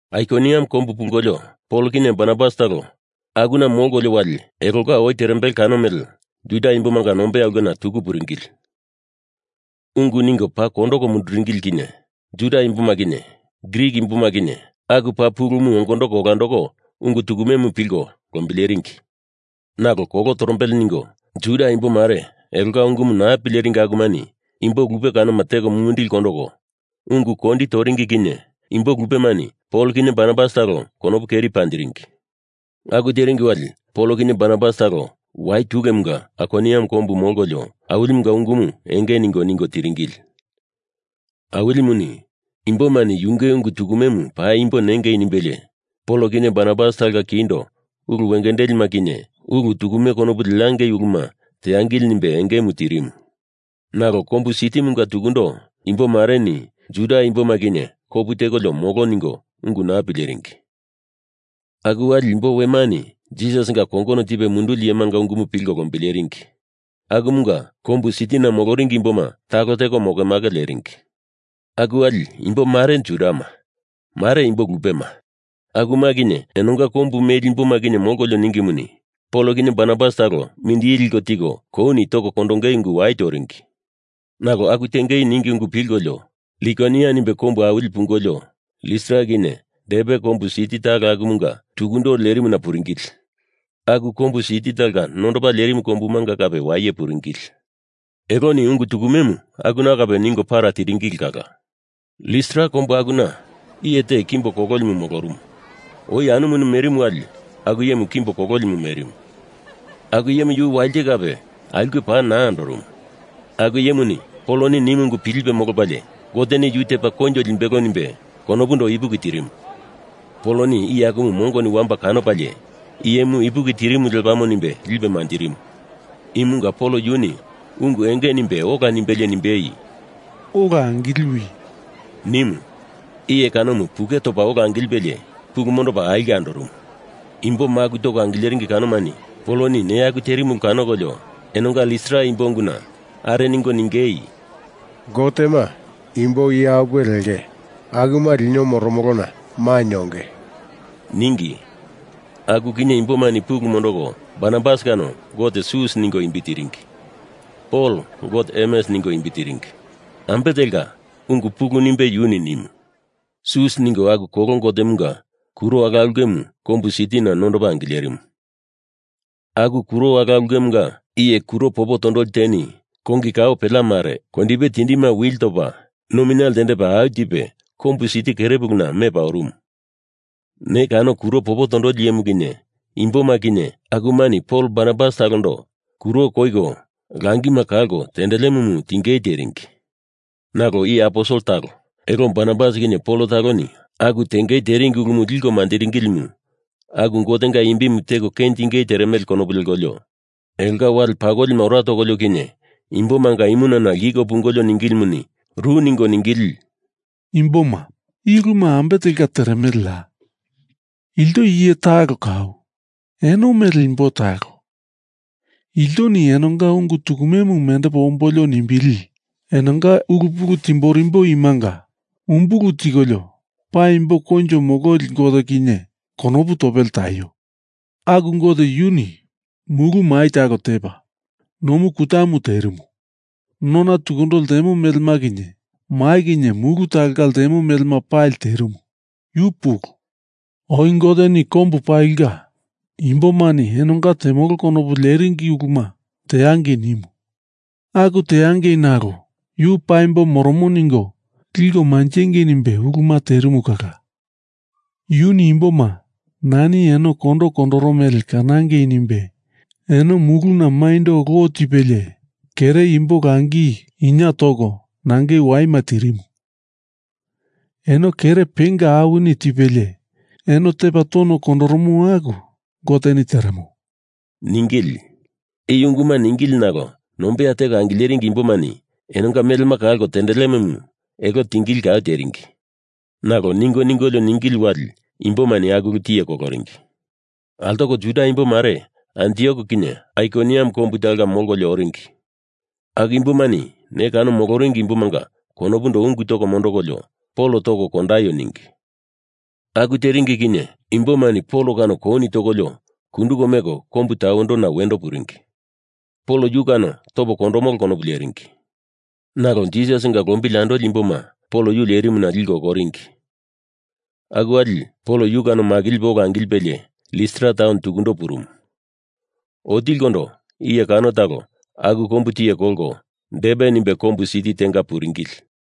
Aikoniam kombu pungolio Pol kinye Barnabas talo akuna molkolio wali elonga oi terembele kano mele Juda imbomanga nombeya ulkena tuku puringili. Ungu ningo paa kondoko munduringili kinye Juda imboma kinye Grik imboma kinye aku paa pulumu ongondoko olandoko ungu tukumemu pilko lombileringi. Nalo kolo torombele ningo Juda imbo mare elonga ungumu naa pileringi akumani imbo lupe kanoma teko mumindili kondoko ungu kondi toringi kinye imbo lupemani Pol kinye Barnabas talo konopu keri panjiringi. Aku teringi wali Pol kinye Barnabas talo wai tulemunga Aikoniam kombu molkolio Awilimunga ungumu enge ningo ningo tiringili. Awilimuni imbomani yunge ungu tukumemu paimbo nengei nimbelie Pol kinye Barnabas talonga kindo ulu wengendelima kinye ulu tukume konopu leangei uluma teangili nimbe engemu tirimu. Nalo kombu sitimunga tukundo imbo mareni Juda imboma kinye kopu tekolio molo ningo ungu naa pileringi. Aku wali imbo wemani Jisasinga kongono tipe munduli iyemanga ungumu pilko lombileringi. Akumunga kombu sitina moloringi imboma talo teko mokemake leringi. Aku wali imbo mare Judama, mare imbo lupema, akuma kinye enonga kombu meli imboma kinye molkolio ningimuni Pol kinye Barnabas talo mindili liko tiko kouni toko kondongei ungu wai toringi. Nalo aku tengei ningi ungu pilkolio Likonia nimbe kombu awili pungolio Listra kinye Derbe kombu siti talo akumunga tukundo lerimuna puringili. Aku kombu siti talonga nondopa lerimu kombumanga kape waye puringili. Eloni ungu tukumemu akuna kape ningo para tiringili kala. Listra kombu akuna iye te kimbo kololimu molorumu. Oi anumuni merimu wali aku iyemu kimbo kololimu merimu. Aku iyemu yu walite kape aulke paa naa andorumu. Aku iyemuni Pol nimu ungu pilipe molopalie Goteni yu tepa koinjo limbelo nimbe konopundo ipuki tirimu. Poloni iye akumu mongoni wamba kanopalie iyemu ipuki tirimu lepamo nimbe lipe manjirimu. Imunga Pol yuni ungu enge nimbe ola nimbelie nimbei, “Ola angiliwi!” nimu. Iye kanomu puke topa ola angilipelie pulu mondopa aulke andorumu. Imbo maku toko angileringi kanomani Poloni neya aku terimu ulu kanokolio enonga Listra imbo unguna are ningo ningei, “Gotema imbo iye apuwe lenge. Akuma lino moromolona mainye onge,” ningi. Aku kinye imbomani pulu mondoko Barnabas kano gote Sus ningo imbi tiringi. Pol gote Hermes ningo imbi tiringi, ambe telka ungu pulu nimbe yuni nimu. Sus ningo aku kolo gotemunga kuro ala ulkemu kombu sitina nondopa angilerimu. Aku kuro ala ulkemunga iye kuro popo tondoli teni kongi kao pelea mare kondipe tindima wili topa nomina ltendepa au tipe kombu siti kere puluna mepa orumu. Ne kano kuro popo tondoli iyemu kinye imboma kinye akumani Pol Barnabas talondo kuro koiko langima kalko tendelemumu tingei teringi. Nalo iye aposel talo, elo Barnabas kinye Pol taloni aku tengei teringi ulumu liko manjiringilimu aku Gotenga imbimu teko kenjindingei teremele konopu lekolio elonga wale pakolima ora tokolio kinye imbomanga imunana lkiko pungolio ningilimuni ru ningo ningili, “Imboma, i uluma ambe telka teremeleya? Ilto iye talo kau, eno mele imbo talo. Iltoni enonga ungu tukumemu mendepo ombolio nimbili, enonga ulu pulu timborimbo imanga umbulu tikolio paimbo koinjo mololi Gote kinye konopu topele taio. Aku Gote yuni mulu mai talo tepa, nomu kutamu terimu. Nona tukundo ltemo melema kinye mai kinye mulu talonga ltemo melema pali terimu, yu pulu. Oi Goteni kombu palinga imbomani enonga temolo konopu leringi uluma teangei nimu. Aku teangei nalo yu paimbo moromo ningo liko manjengei nimbe uluma terimu kala. Yuni imboma Nani eno kondo kondoro mele kanangei nimbe eno muluna maindo lo tipelie kere imbo langi inie toko nangei waima tirimu. Eno kere penga awini tipelie eno tepa tono kondoromo aku Goteni teremo,” ningili. I unguma ningili nalo nombeya teko angileringi imbomani enonga melema kalko tendelemumu elo tingei kau teringi. Nalo ningo ningolio ningili wali imbomani aku ulu tiye koloringi. Altoko Juda imbo mare Antiok kinye Aikoniam kombu talonga molkolio oringi. Aku imbomani ne kano moloringi imbomanga konopundo ungu toko mondondokolio Pol toko kondaio ningi. Aku teringi kinye imbomani Pol kano kouni tokolio kunduko meko kombu tawendona wendo puringi. Pol yu kano topo kondomolo konopu leringi. Nalo Jisasinga lombili andoli imboma Pol yu lerimuna liko okoringi. Aku wali Pol yu kano makilipe ola angilipelie Listra taun tukundo purumu. Otilikondo iye kano talo aku kombu tiye kolkolo Derbe nimbe kombu siti tenga puringili.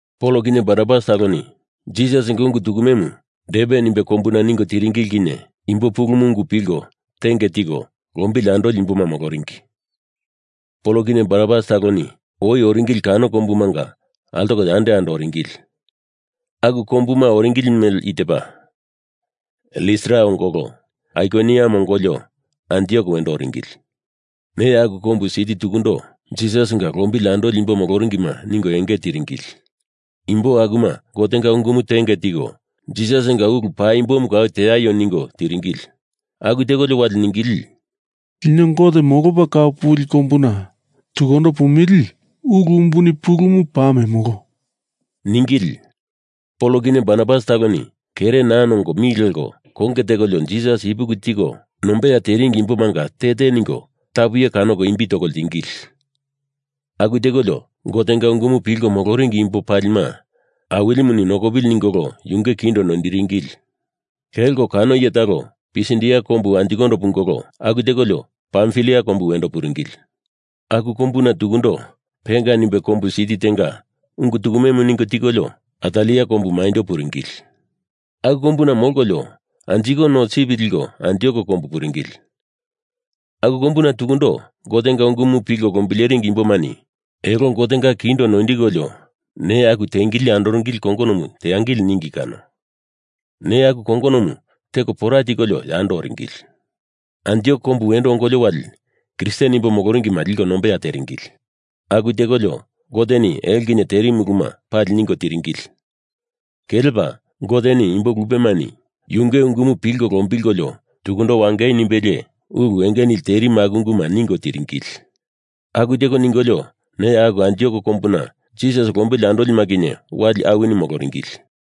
Pol kinye Barnabas taloni Jisasinga ungu tukumemu Derbe nimbe kombuna ningo tiringili kinye imbo pulumu ungu pilko tenge tiko lombili andoli imboma moloringi. Pol kinye Barnabas taloni oi oringili kano kombumanga altoko yando yando oringili. Aku kombuma oringili mele i tepa: Listra ongolo Aikoniam ongolio Antiok wendo oringili. Neya aku kombu siti tukundo Jisasinga lombili andoli imbo moloringima ningo enge tiringili. Imbo akuma Gotenga ungumu tenge tiko Jisasinga ulu paimbomu kau teaio ningo tiringili. Aku tekolio wali ningili, “Lino Gote molopa kau puli kombuna tukundo pumili ulu umbuni pulumu paa memolo,” ningili. Pol kinye Barnabas taloni kere naa nongo mi leko konge tekolio Jisas ipuki tiko nombeya teringi imbomanga te te ningo tapu iyema kanoko imbi toko ltingili. Aku tekolio Gotenga ungumu pilko moloringi imbo palima Awilimuni nokopili ningolo yunge kindo noindiringili. Kelko kano iye talo Pisidia kombu anjikondo pungolo aku tekolio Pamfilia kombu wendo puringili. Aku kombuna tukundo Perga nimbe kombu siti tenga ungu tukumemu ningo tikolio Atalia kombu maindo puringili. Aku kombuna molkolio anjiko no sip liko Antiok kombu puringili. Aku kombuna tukundo Gotenga ungumu pilko lombileringi imbomani elo Gotenga kindo noindikolio neya aku teliko andoringili kongonomu teangili ningi kano. Neya aku kongonomu teko pora tikolio yando oringili. Antiok kombu wendo ongolio wali Kristen imbo moloringima liko nombeya teringili. Aku tekolio Goteni elo kinye terimu uluma pali ningo tiringili. Kelepa Goteni imbo lupemani yunge ungumu pilko lombilkolio tukundo wangei nimbelie ulu enge nili terimu aku unguma ningo tiringili. Aku teko ningolio neya aku Antiok kombuna Jisasinga lombili andolima kinye wali awini moloringili.